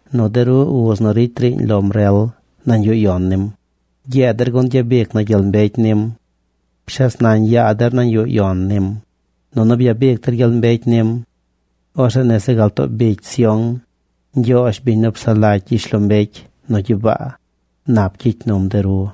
nu de ru uz nu ricy riiñ lom rel nañ yuꞌ yon nim, gyeed der gun gyabic na gyel mbecy nim! ¡Pshes nañ yaa der nañ yuꞌ yon nim, nunu byabic der gyel mbecy nim! ¡Orzeꞌ nese gal too bicy Sión, Ñgyoozh, biñ nu psaꞌ lagy gyishlombecy nu gyibaa, nap gyicy num de ru!